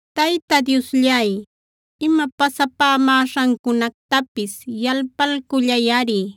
Tayta Diosllay, ima pasapämäśhancunactapis yalpalcullayꞌari.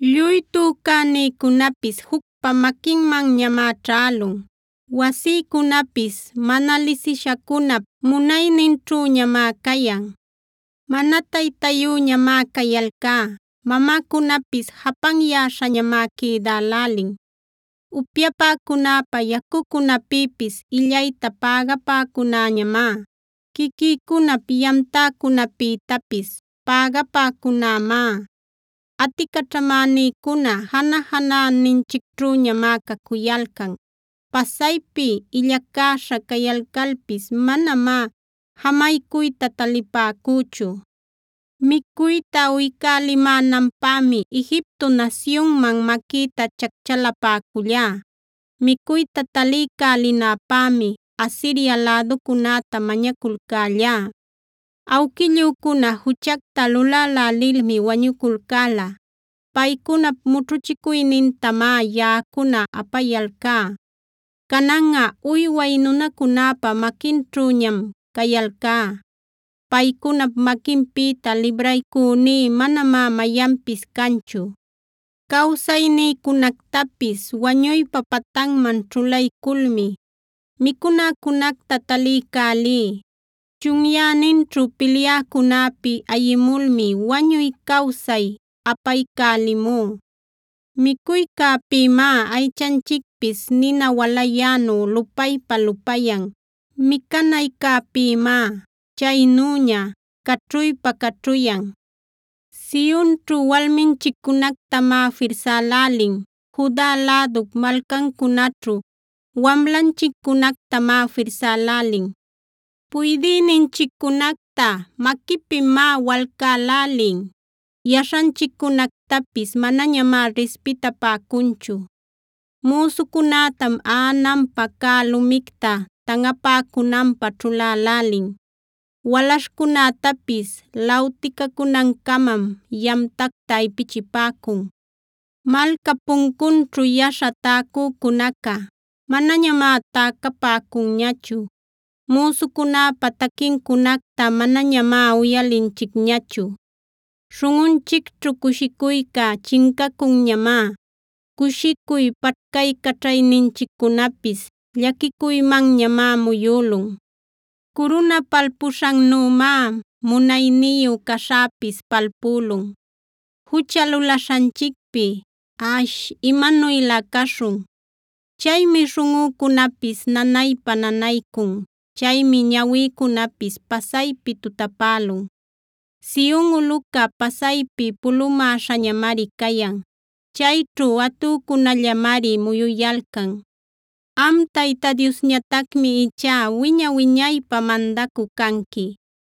Lluy tücänïcunapis jucpa maquinmanñamá ćhälun; wasïcunapis mana lisishacunap munayninćhüñamá cayan. Mana taytayüñamá cayalcá; mamäcunapis japanyäśhañamá quïdälälin. Upyapäcunäpä yacucunäpïpis illayta pägapäcünäñamá; quiquïcunap yamtäcunäpïtapis pägapäcunämá. Aticaćhamänïcuna janä-janäninchicćhüñamá cacuyalcan. Pasaypi illacäśha cayalcalpis manamá jamaycuyta talipäcüchu. Micuyta uycälimänanpämi Egipto nasyunman maquïta chacchalapäcullá; micuyta taliycälinäpämi Asiria läducunäta mañaculcällá. Awquillücuna juchacta lulälälilmi wañuculcäla; paycunap mućhuchicuynintamá yaꞌacuna apayalcá. Cananꞌa uyway nunacunäpa maquinćhüñam cayalcá; paycunap maquinpïta libraycüní manamá mayanpis canchu. Cawsaynïcunactapis wañuypa patanman ćhulayculmi, micunäcunacta taliycälí; chunyäninćhu pilyäcunäpi ayimulmi wañuy cawsay apaycälimú. Micuycäpïmá aychanchicpis nina walayänu lupaypa-lupayan; micanaycäpïmá chaynüña caćhuypa-caćhuyan. Sionćhu walminchiccunactamá firsälälin; Juda lädup malcancunaćhu wamlanchiccunactamá firsälälin. Puydïninchiccunacta maquipïmá walcälälin; yaśhanchiccunactapis manañamá rispitapäcunchu. Müsucunätam aꞌananpä cä lumicta tanꞌapäcunanpä ćhulälälin; walaśhcunätapis lawticacunancamam yamtacta ipichipäcun. Malcap puncunćhu yaśha täcücunaca manañamá täcapäcunñachu; müsucunäpa taquincunacta manañamá uyalinchicñachu. Śhunꞌunchicćhu cushicuyca chincacunñamá; cushicuy paćhcaycaćhayninchiccunapis llaquicuymanñamá muyülun. Curuna palpuśhannümá munayniyu caśhäpis palpülun; jucha lulaśhanchicpi ¡ash, imanuylä caśhun! Chaymi śhunꞌücunapis nanaypa-nanaycun; chaymi ñawïcunapis pasaypi tutapälun. Sion ulꞌuca pasaypi pulumäśhañamari cayan; chayćhu atücunällañamari muyuyalcan. Am Tayta Diosñatacmi ichá wiña-wiñaypä mandacü canqui.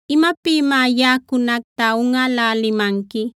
¿Imapïmá yaꞌacunacta unꞌälälimanqui?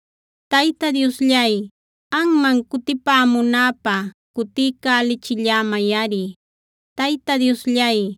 Tayta Diosllay, anman cutipämunäpä cutiycälichillämayꞌari. Tayta Diosllay,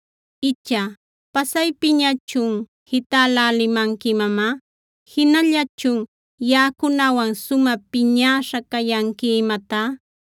Icha ¿pasaypiñachun jitälälimanqui imamá? ¿Jinallalächun yaꞌacunawan sumä piñäśha cayanqui imatá?